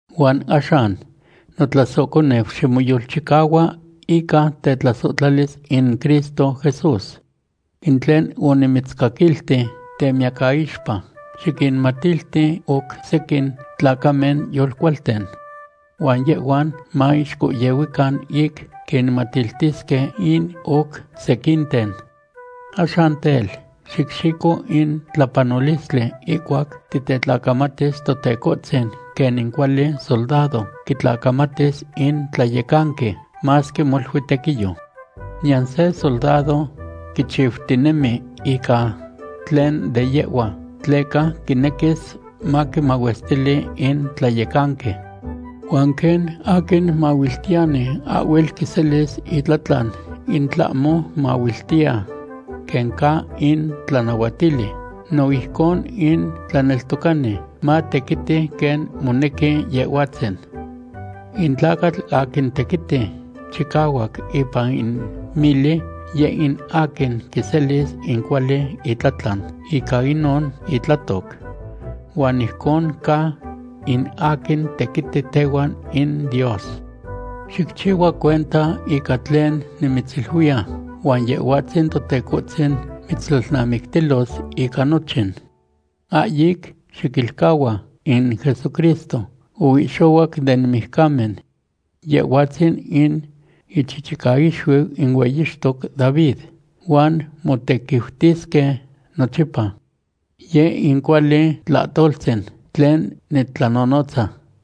Huan axan, notlasohconeu, ximoyolchicahua ica tetlasohtlalis in Cristo Jesús. In tlen onimitzcaquilti temiyacaixpa, xiquinmatilti oc sequin tlacamen yolcualten. Huan yehhuan maixcohyehuican ic quinmatiltisque in oc sequinten. Axan tel, xicxico in tlapanolistli ihcuac titetlacamatis Totecohtzin quen in cuali soldado quitlacamatis in tlayecanqui, masque molui tequiyo. Niyan se soldado quichiutinemi ica tlen de yehhua, tleca quinequis maquimahuestili in tlayecanqui. Huan quen aquin mahuiltiyani ahhuel quiselis itlatlan in tlahmo mahuiltiya quen ca in tlanahuatili, no ijcon in tlaneltocani matequiti quen monequi Yehhuatzin. In tlacatl aquin tequiti chicahuac ipan in mili, yeh in aquin quiselis in cuali itlatlan ica inon itlatoc. Huan ijcon ca in aquin tequiti tehuan in Dios. Xicchihua cuenta ica tlen nimitziluiya huan Yehhuatzin Totecohtzin mitztlalnamictilos ica nochin. Ahyic xiquilcahua in Jesucristo oihxohuac den mijcamen. Yehhuatzin in ichichicaixuiu in hueyixtoc David huan motequiutisque nochipa. Yeh in cuali tlahtoltzin tlen nitlanonotza.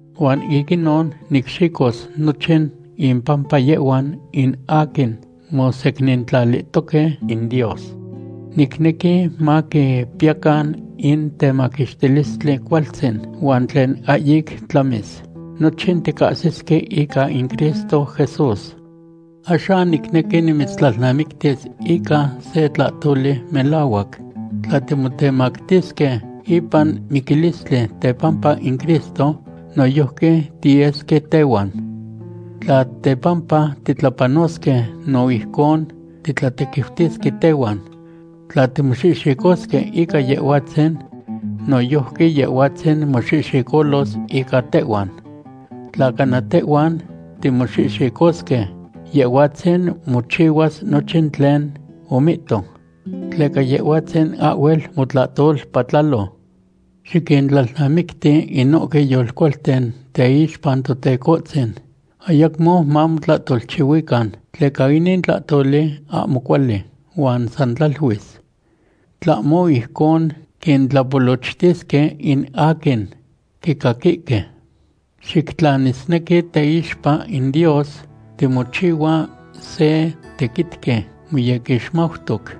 Huan ic inon nicxicos nochin impampa yehhuan in aquin mosecnintlalihtoque in Dios. Nicnequi maquipiyacan in temaquixtilistli cualtzin huan tlen ahyic tlamis. Nochin ticahsisque ica in Cristo Jesús. Axan nicnequi nimitztlalnamictis ica se tlahtoli melahuac: Tla timotemactisque ipan miquilistli tepampa in Cristo, noyojqui tiyesque tehuan. Tla tepampa titlapanosque, no ijcon titlatequiutisque tehuan. Tla timoxihxicosque ica Yehhuatzin, noyojqui Yehhuatzin moxihxicolos ica tehhuan. Tla cana tehhuan timoxihxicosque, Yehhuatzin mochihuas nochin tlen omihto. Tleca Yehhuatzin ahhuel motlahtolpatlalo. Xiquintlalnamicti inohque yolcualten teixpa Totecohtzin, ayacmo mamotlahtolchihuican, tleca inin tlahtoli ahmo cuali huan san tlaluis. Tlahmo ijcon quintlapolochtisque in aquin quicaquihque. Xictlanisnequi teixpa in Dios timochihua se tequitqui moyequixmautoc.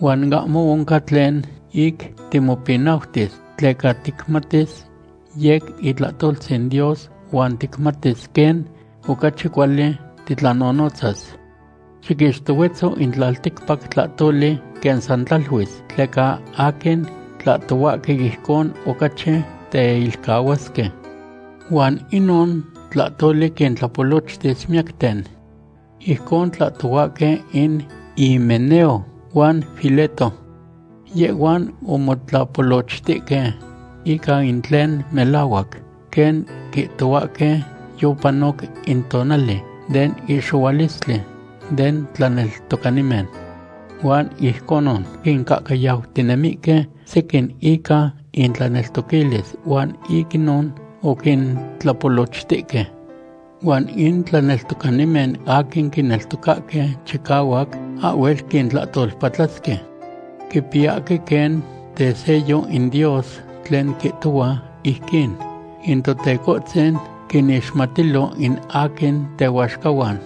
Huan ahmo oncan tlen ic timopinautis, tleca ticmatis yec itlahtoltzin Dios huan ticmatis quen ocachi cuali titlanonotzas. Xiquixtohuetzo in tlalticpac tlahtoli quen san tlaluis, tleca aquin tlahtohuahque ijcon ocachi teilcahuasque. Huan inon tlahtoli quintlapolochtis miyacten. Ijcon tlahtohuahque in Himeneo huan Fileto. Yehhuan omotlapolochtihque ica in tlen melahuac quen quihtohuahque yopanoc in tonali den ihxohualistli den tlaneltocanimen. Huan ijconon quincahcayautinemihque sequin ica intlaneltoquilis huan ic inon oquintlapolochtihque. Huan in tlaneltocanimen aquin quineltocahque chicahuac ahhuel quintlahtolpatlasque. Quipiyahque quen tesello in Dios tlen quihtohua ijquin: “In Totecohtzin quinixmatilo in aquin tehuaxcahuan.”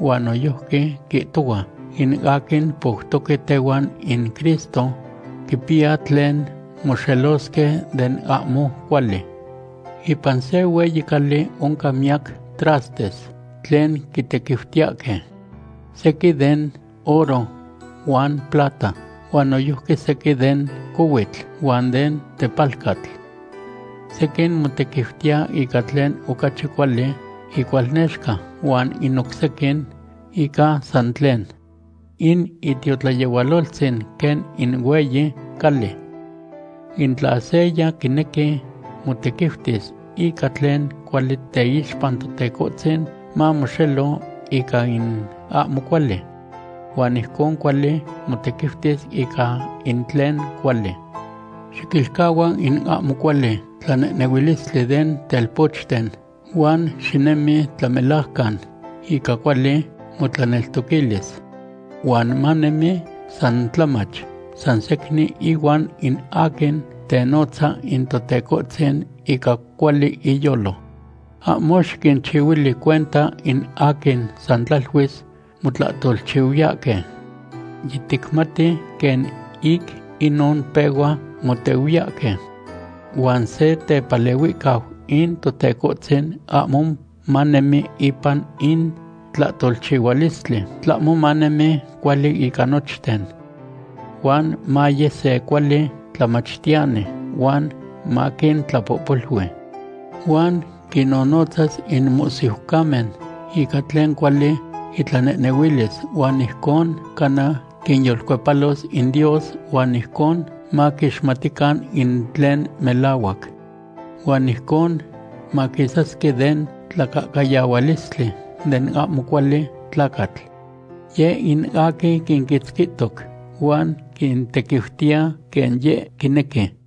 Huan noyojqui quihtohua: “In aquin poutoque tehuan in Cristo quipiya tlen moxelosque den ahmo cuali.” Ipan se hueyi cali oncan miyac trastes tlen quitequiutiyahque. Sequin den oro huan plata, huan noyojqui sequin den cohuitl huan den tepalcatl. Sequin motequiutiya ica tlen ocachi cuali icualnexca huan in oc sequin ica san tlen. In itiotlayehualoltzin quen in hueyi cali. In tla seya quinequi motequiutis ica tlen cuali teixpa Totecohtzin, mamoxelo ica in ahmo cuali. Huan ijcon cuali motequiutis ica in tlen cuali. Xiquilcahua in ahmo cuali tlanehnehuilistli den telpochten huan xinemi tlamelajcan, ica cuali motlaneltoquilis. Huan manemi san tlamach, sansecnin ihuan in aquin tenotza in Totecohtzin ica cuali iyolo. Ahmo xiquinchihuili cuenta in aquin san tlaluis motlahtolchihuiyahque. Yiticmati quen ic inon pehua motehuiyahque. Huan se tepalehuihcau in Totecohtzin ahmo manemi ipan in tlahtolchihualistli, tlahmo manemi cuali ica nochten. Huan maye se cuali tlamachtiyani huan maquintlapohpolui. Huan quinnonotzas in mohsiucamen ica tlen cuali itlanehnehuilis huan ijcon cana quinyolcuepalos in Dios huan ijcon maquixmatican in tlen melahuac. Huan ijcon maquisasque den tlacahcayahualistli den ahmo cuali tlacatl. Yeh in aquin quinquitzquihtoc huan quintequiutiya quen yeh quinequi.